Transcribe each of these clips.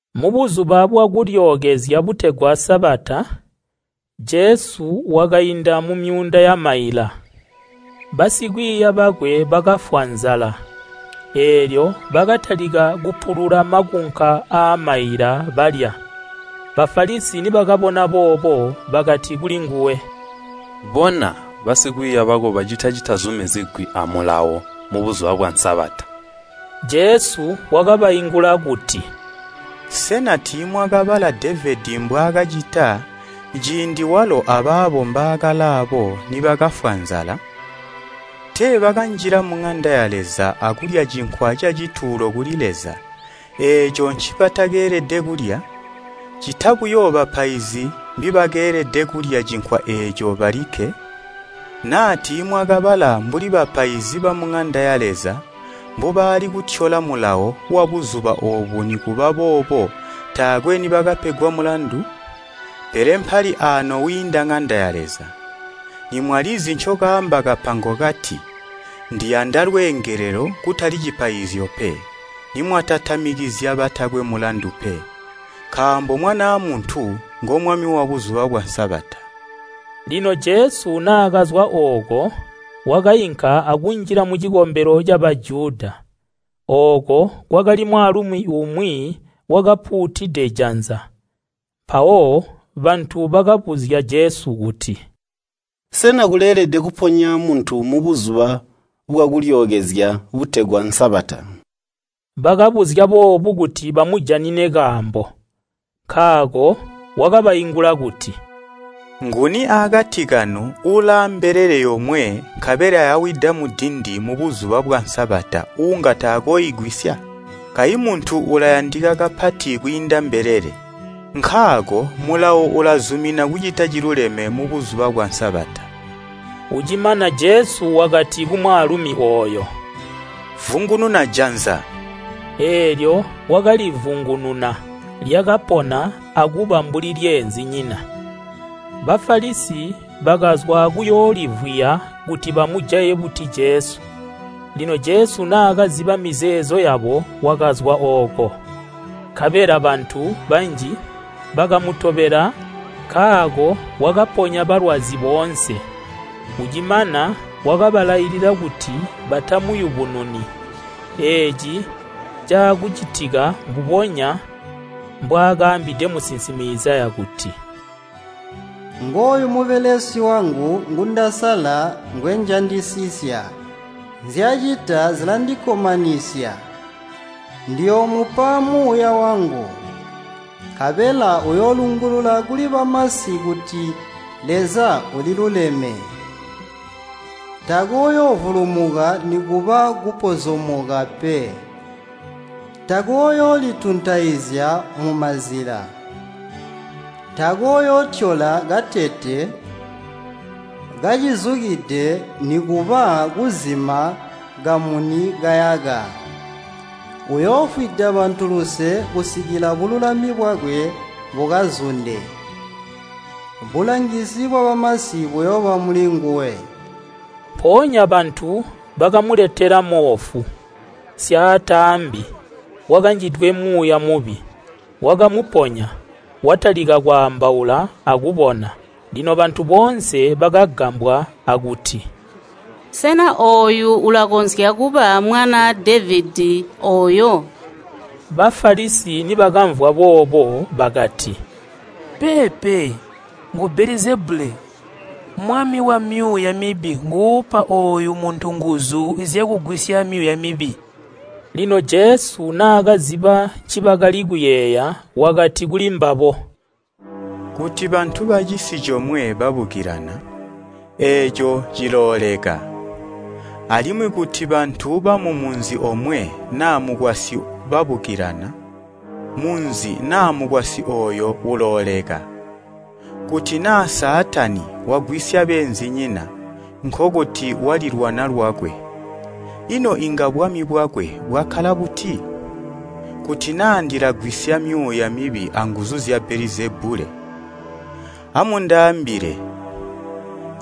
Mubuzuba bwa Kulyookezya butegwa Sabata, Jesu wakainda mumyuunda yamaila, basikwiiya bakwe bakafwa nzala. Eelyo bakatalika kupulula makunka aamaila balya. Bafalisi nibakabona boobo bakati kuli nguwe, “Bona basikwiiya bako bacita citazumizigwi amulawo mu Buzuba bwa Sabata.” Jesu wakabaingula kuti, “Sena tiimwakabala Devedi mbwaakacita, ciindi walo abaabo mbaakalaabo nibakafwa nzala? Tee bakanjila muŋanda ya Leza akulya cinkwa cacituulo kuli Leza, eeco ncibatakeelede kulya, ccita buyo bapaizi mbibakeelede kulya cinkwa eeco balikke? Naa tiimwakabala mbuli bapaizi ba muŋanda ya Leza mbubaali kutyola mulawo wa Buzuba oobu nikuba boobo taakwe nibakapegwa mulandu? Pele mpali aano wiinda ŋanda ya Leza. Nimwalizi ncokaamba kapango kati, ‘Ndiyanda lweengelelo kutali cipaizyo pe,’ nimwatatamikizya batakwe mulandu pe. Nkaambo Mwanaa Muntu ngomwami wa Buzuba bwa Sabata.” Lino Jesu naakazwa ooko wakainka akunjila mucikombelo ca Bajuda. Ooko kwakali mwaalumi umwi wakapuutide janza. Mpawo bantu bakabuzya Jesu kuti, “Sena kuleelede kuponya muntu mu Buzuba bwa Kulyookezya butegwa Sabata?” Bakabuzya boobu kuti bamujanine kaambo. Nkaako wakabaingula kuti, “Nguni aakati kanu ulaa mbelele yomwe nkabela yawida mudindi mu Buzuba bwa Sabata uunga takooigwisya? Kayi muntu ulayandika kapati kwiinda mbelele. Nkaako mulawo ulazumina kucita ciluleme mu Buzuba bwa Sabata.” Ucimana Jesu wakati kumwaalumi ooyo, “Vungununa janza.” Eelyo wakalivungununa, lyakapona akuba mbuli lyeenzinyina. Bafalisi bakazwa akuyoolivwiya kuti bamujaye buti Jesu. Lino Jesu naakaziba mizeezo yabo wakazwa ooko. Nkabela bantu banji bakamutobela nkaako wakaponya balwazi boonse. Ucimana wakabalailila kuti batamuyubununi. Eeci caakucitika mbubonya mbwaakaambide musinsimi Izaya kuti, “Ngooyu mubelesi wangu ngundasala ngwenjandisisya. Nzyacita zilandikkomanisya. Ndiyoomupa muuya wangu, nkabela uyoolungulula kuli bamasi kuti Leza uliluleme. Takooyoovulumuka nikuba kupozomoka pe. Takooyoolituntaizya mumazila. Takooyootyola katete kacuzukide nikuba kuzima kamuni kayaka. Uyoofwida bantu luse kusikila bululami bwakwe bukazunde. Bulangizi bwabamasi buyooba muli nguwe.” Mpoonya bantu bakamuletela moofu, syataambi, wakanjidwe muuya mubi. Wakamuponya, watalika kwaambaula akubona. Lino bantu boonse bakagambwa akuti, “Sena ooyu ulakonzya kuba mwanaa Devedi ooyo?” Bafalisi nibakamvwa boobo bakati, “Peepe, ngu Belizebule, mwami wamyuuya mibi nguupa ooyu muntu nguzu zya kugwisya myuuya mibi.” Lino Jesu naakaziba ncibakali kuyeeya wakati kulimbabo, “Kuti bantu bacisi comwe babukilana, eeco cilooleka. Alimwi kuti bantu bamumunzi omwe naa mukwasyi babukilana, munzi naa mukwasyi ooyo ulooleka. Kuti naa Saatani wagwisya beenzinyina, nkokuti walilwana lwakwe. Ino inga bwami bwakwe bwakkala buti? Kuti naa ndilagwisya myuuya mibi anguzu zya Belizebule, amundaambile,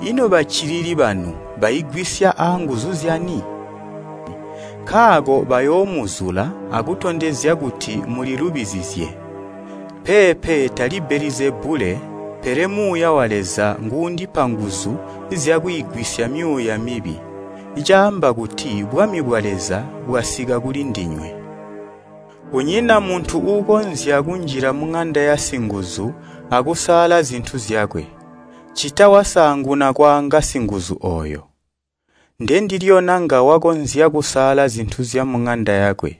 ino baccilili banu baigwisya aanguzu zyani? Nkaako bayoomuzula akutondezya kuti mulilubizizye. Peepe tali Belizebule, pele Muuya wa Leza nguundipa nguzu zyakwiigwisya myuuya mibi, caamba kuti bwami bwa Leza bwasika kuli ndinywe. Kunyina muntu uukonzya kunjila muŋanda yasinguzu akusaala zintu zyakwe, ccita wasaanguna kwaanga singuzu ooyo. Ndendilyo nanga wakonzya kusaala zintu zyamuŋanda yakwe.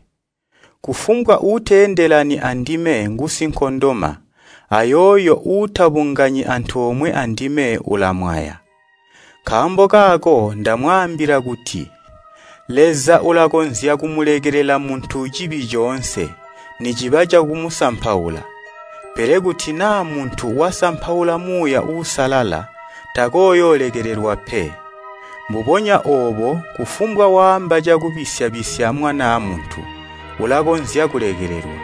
Kufumbwa uuteendelani andime ngusinkondoma ayooyo uutabunganyi antoomwe andime ulamwaya. Nkaambo kaako ndamwaambila kuti Leza ulakonzya kumulekelela muntu cibi coonse, niciba cakumusampaula. Pele kuti naa muntu wasampaula Muuya Uusalala takooyoolekelelwa pe. Mbubonya oobo kufumbwa waamba cakubisya-bisya Mwanaa Muntu ulakonzya kulekelelwa,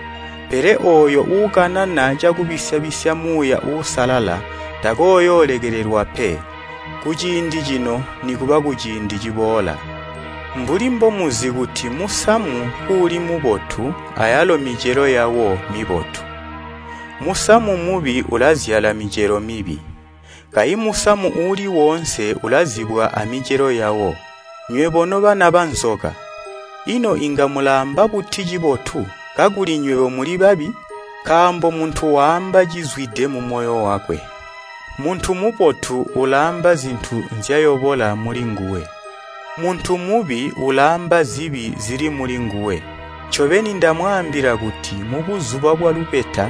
pele ooyo uukanana cakubisya-bisya Muuya Uusalala takooyoolekelelwa pe, kuciindi cino nikuba kuciindi ciboola.” “Mbuli mbomuzi kuti musamu kuuli mubotu ayalo micelo yawo mibotu, musamu mubi ulazyala micelo mibi. Kayi musamu uuli woonse ulazibwa amicelo yawo. Nywebo nobana banzoka! Ino inga mulaamba buti cibotu, kakuli nywebo muli babi? Nkaambo muntu waamba cizwide mumoyo wakwe. Muntu mubotu ulaamba zibotu nzyayobola muli nguwe, muntu mubi ulaamba zibi zili muli nguwe. Ncobeni ndamwaambila kuti mubuzuba bwalubeta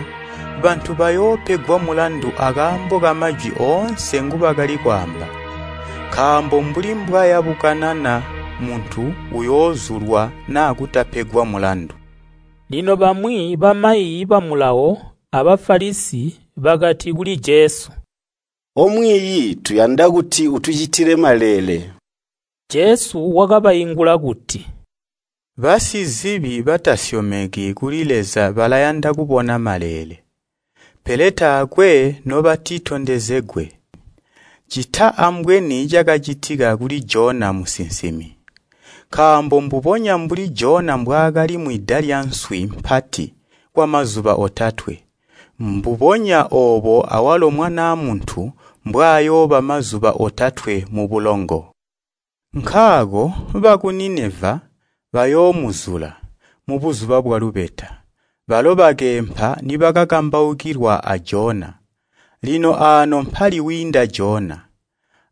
bantu bayoopegwa mulandu akaambo kamajwi oonse ngubakali kwaamba. Nkaambo mbuli mbwaya kukanana muntu uyoozulwa naa kutapegwa mulandu.” Lino bamwi bamayi ba Mulawo a Bafalisi bakati kuli Jesu, “Omwiiyi tuyanda kuti utucitile maleele.” Jesu wakabaingula kuti, “Basizibi batasyomeki kuli Leza balayanda kubona maleele, pele taakwe nobatitondezegwe, ccita ambweni cakacitika kuli Jona musinsimi. Nkaambo mbubonya mbuli Jona mbwaakali mwida lyanswi mpati kwamazuba otatwe, mbubonya oobo awalo Mwanaa Muntu mbwayooba mazuba otatwe mubulongo. Nkaako baku Nineva bayoomuzula, mubuzuba bwalubeta, balo bakeempa nibakakambaukilwa a Jona. Lino aano mpali wiinda Jona.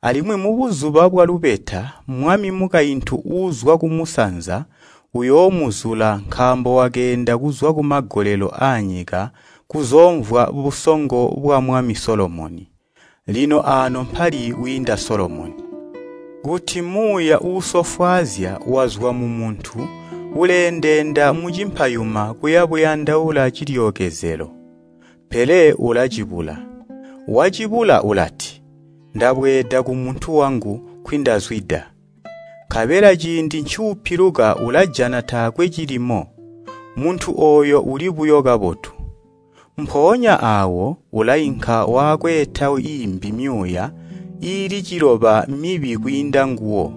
Alimwi mubuzuba bwalubeta mwami mukaintu uuzwa kumusanza uyoomuzula nkaambo wakeenda kuzwa kumagolelo aanyika kuzoomvwa busongo bwamwami Solomoni. Lino aano mpali wiinda Solomoni. “Kuti muuya uusofwaazya wazwa mumuntu uleendeenda mucimpayuma kuyabuyandaula cilyookezelo, pele ulacibula. Wacibula ulati, ‘Ndabweeda kumuntu wangu nkwindazwida!’ Nkabela ciindi ncuupiluka ulajana taakwe cilimo, muntu ooyo uli buyo kabotu. Mpoonya aawo ulainka wakweeta iimbi myuuya iili ciloba mibi kwiinda nguwo,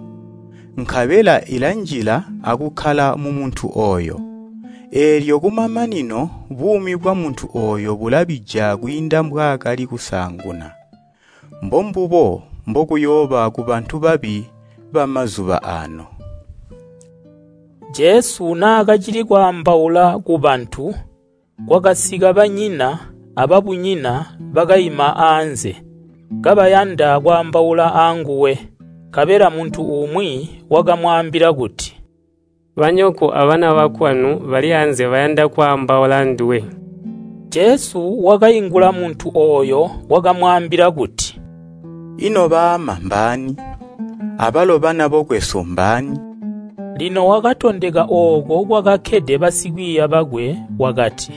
nkabela ilanjila akukkala mumuntu ooyo. Eelyo kumamanino buumi bwamuntu ooyo bulabija kwiinda mbwaakali kusaanguna. Mbombubo mbokuyooba kubantu babi mbaazuba aano.” Jesu naakacili kwaambaula kubantu, kwakasika banyina ababunyina bakaima aanze, kabayanda kwaambaula anguwe. Nkabela muntu umwi wakamwaambila kuti, “Banyoko abana bokwanu bali anze bayanda kwaambaula anduwe.” Jesu wakaingula muntu ooyo wakamwaambila kuti, “Ino baama mbaani, abalo bana bokwesu mbaani?” Lino wakatondeka ooko kwakakkede basikwiiya bakwe, wakati,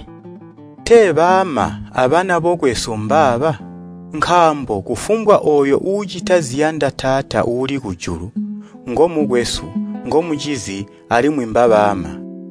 “Tee baama abana bokwesu mbaaba! Nkaambo kufumbwa ooyo uucita ziyanda Taata uuli kujulu, ngomukwesu, ngomucizi alimwi mbabaama.”